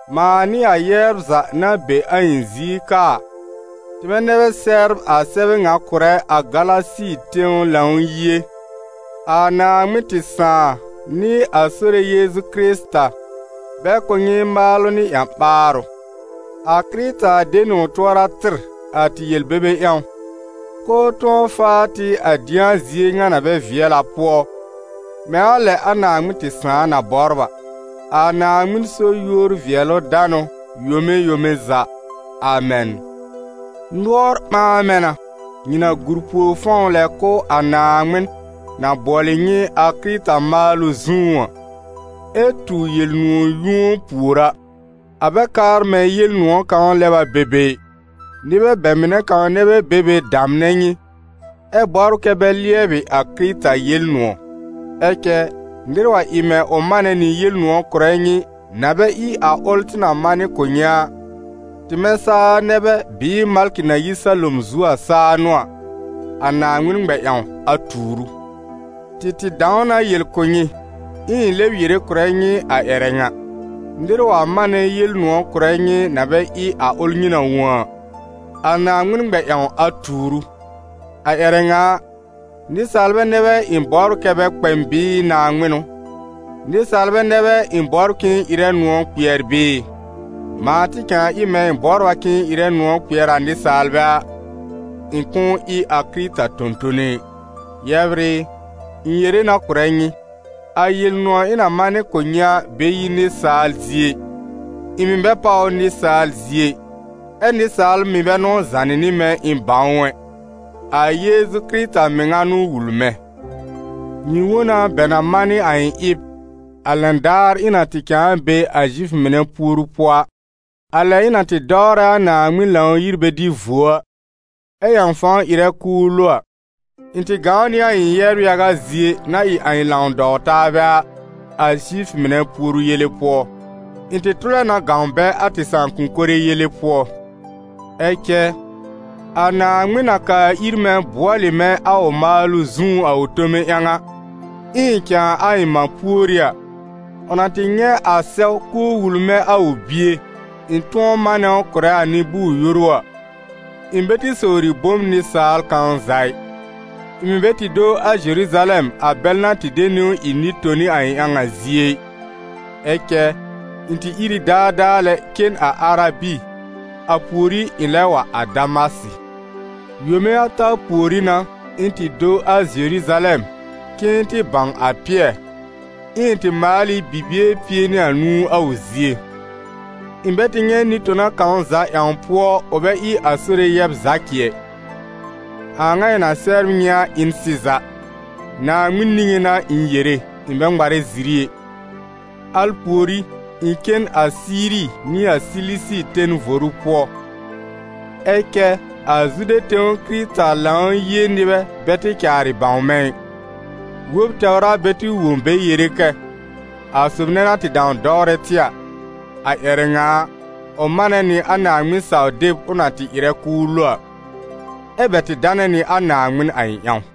mãa nɩ a yɛbr za na be a ɩ̃ zie ka a, tɩmɛ nɛ bɛ sɛbr a sɛbɛ ŋa kʋ̀rɛ a Galasi tẽw Lãw-yie: a Naaŋmɩn tɩ Sãà nɩ a Sore Yeezu Kɩrɩta, bɛ kʋ̀ nyɩ maalʋ nɩ ƴã-ɓaarʋ. A Kɩrɩta de nɩ ʋ tʋɔra tɩr, a tɩ yel-bebe ƴãw, k'ʋʋ tʋ̃ɔ faa tɩ a dɩ̃a zie ŋa na bɛ vɩɛl a pʋɔ, mɛ̃ a lɛ a Naaŋmɩn tɩ Sãà na bɔbr a. A Naaŋmɩn so yúor-vɩɛlʋ-danʋ yome yome za. Amɛn. Nʋɔr ɓãa mɛ̃ na, nyɩ na gùr pùor fɔ̃w lɛ kʋ̀ a Naaŋmɩn na bʋɔlɩ nyɩ a Kɩrɩta maalʋ zũú a, ɛ tu Yel-nʋ̃ɔ̀ yũo pùor a. A bɛ kaar mɛ̃ Yel-nʋ̃ɔ̀ kãw lɛb a be be ɩ, nɩbɛ bɛ mɩnɛ kãw nɛ bɛ be be damnɛ nyɩ, ɛ bɔbr kɛ bɛ lɩɛbɩ a Kɩrɩta Yel-nʋ̃ɔ̀. Ɛ cɛ nɩr wa ɩ mɛ̃ ʋ manɛ nɩ Yel-nʋ̃ɔ̀ kʋ̀rɛ nyɩ, na bɛ ɩ a ʋl tɩ na manɩ kʋ̀ nyɩ a, tɩmɛ saa nɛ bɛ bɩɩ malkɩ na yi salom zu a saa n'ʋ a, a Naaŋmɩn ŋmɛ-ƴãw a tuur ʋ! Tɩ tɩ dãw na yel kʋ̀ nyɩ, ɛ ɩ̃ lɛb yere kʋ̀rɛ nyɩ a ƴɛrɛ ŋa: nɩr wa manɛ Yel-nʋ̃ɔ̀ kʋ̀rɛ nyɩ na bɛ ɩ a ʋl nyɩ na wõ a, a Naaŋmɩn ŋmɛ-ƴãw a tuur ʋ! A ƴɛrɛ ŋa a, nɩsaalbɛ nɛ bɛ ɩ̃ bɔbr kɛ́ bɛ kpɛ m bɩɩ Naaŋmɩn n'ʋ? Nɩsaalbɛ nɛ bɛ ɩ̃ bɔbr k'ɩ̃ɩ ɩrɛ nʋ̃ɔ̀ kpɩɛr bɩɩ? Mãa tɩ cãa ɩ mɛ̃ ɩ̃ bɔbr a k'ɩ̃ɩ ɩrɛ nʋ̃ɔ̀ kpɩɛr a nɩsaalbɛ a, ɩ̃ kʋ̃ʋ ɩ a Kɩrɩta tõ-tõne ɩ. Yɛbr ɩ, ɩ̃ yere na kʋ̀rɛ nyɩ, a Yel-nʋ̃ɔ̀ ɩ̃ na manɩ kʋ̀ nyɩ a bɛ yi nɩsaal zie ɩ. Ɩ̃ mɩ̀ bɛ páw ʋ nɩsaal zie ɩ, ɛ́ nɩsaal mɩ̀ bɛ n'ʋ zànɩ nɩ mɛ̃ ɩ̃ bãw ʋ ɛ, a Yeezu Kɩrɩta mɩŋa n'ʋ wul mɛ̃. Nyɩ wõ na bɛ na manɩ a ɩ̃ ɩb, a lɛn daar ɩ̃ na tɩ cãa be a Zifʋ mɩnɛ puoru pʋɔ a: a lɛ ɩ̃ na tɩ dɔwrɛ a Naaŋmɩn Lãw-yir bɛ dɩ vuo a, ɛ ƴãw fãw ɩrɛ k'ʋʋ lo a. Ɩ̃ tɩ gãw nɩ a ɩ̃ yɛbr yaga zie na ɩ a ɩ̃ lãw-dɔw-taabɛ a, a Zifʋ mɩnɛ puoru yele pʋɔ. Ɩ̃ tɩ tʋlɛ na gãw bɛ a tɩ sãakʋ̃-kore yele pʋɔ. Ɛ cɛ, a Naaŋmɩn na kaa ir mɛ̃ bʋɔlɩ mɛ̃ a ʋ maalʋ zũú a ʋ tome ƴãw a, ɩ̃ɩ cãa a ɩ̃ mã pùorí a, ʋ na tɩ nyɛ̃ a sɛw k'ʋʋ wul mɛ̃ a ʋ Bie, ɩ̃ tʋ̃ɔ manɛ ʋ kʋ̀rɛ a nɩ-bʋʋr-yoru a, ɩ̃ bɛ tɩ sowri bom nɩsaal kãw za ɩ; ɩ̃ mɩ̀ bɛ tɩ do a Zeruzalɛm a bɛl na tɩ de niwn ɩ nɩ-toni a ɩ̃ ƴãw a zie ɩ; ɛ cɛ ɩ̃ tɩ ìr ɩ daadaa lɛ cen a Arabi, a pùorí ɩ̃ lɛb wa a Damasɩ. Yome ata pùorí n'a, ɩ̃ tɩ do a Zeruzalɛm k'ɩ̃ɩ tɩ bãw a Pɩɛr, ɛ ɩ̃ tɩ maal ɩ bibie pie nɩ anũu a ʋ zie. Ɩ̃ bɛ tɩ nyɛ̃ nɩ-tona kãw za ƴãw pʋɔ, ʋ bɛ ɩ a Sore yɛb Zakɩ ɛ. A a ŋa ɩ̃ na sɛbr nyɩ a ɩ n sɩza, Naaŋmɩn niŋé n'a ɩ̃ yere, ɩ̃ bɛ ŋmarɛ ziri ɛ. Al pùorí, ɩ̃ cen a Siiri nɩ a Silisi ten voru pʋɔ. Ɛ cɛ a Zude tẽw Kɩrɩta Lãw-yie nɩbɛ bɛ tɩ caarɩ bãw mɛ̃ ɩ. Wob tɛwr a bɛ tɩ wõ bɛ yere kɛ: «A sob nɛ na tɩ dãw dɔwrɛ tɩ a, a ƴɛrɛ ŋa a, ʋ manɛ nɩ a Naaŋmɩn-saw-deb ʋ na tɩ ɩrɛ k'ʋʋ lo a.» Ɛ́ bɛ tɩ danɛ nɩ a Naaŋmɩn a ɩ̃ ƴãw.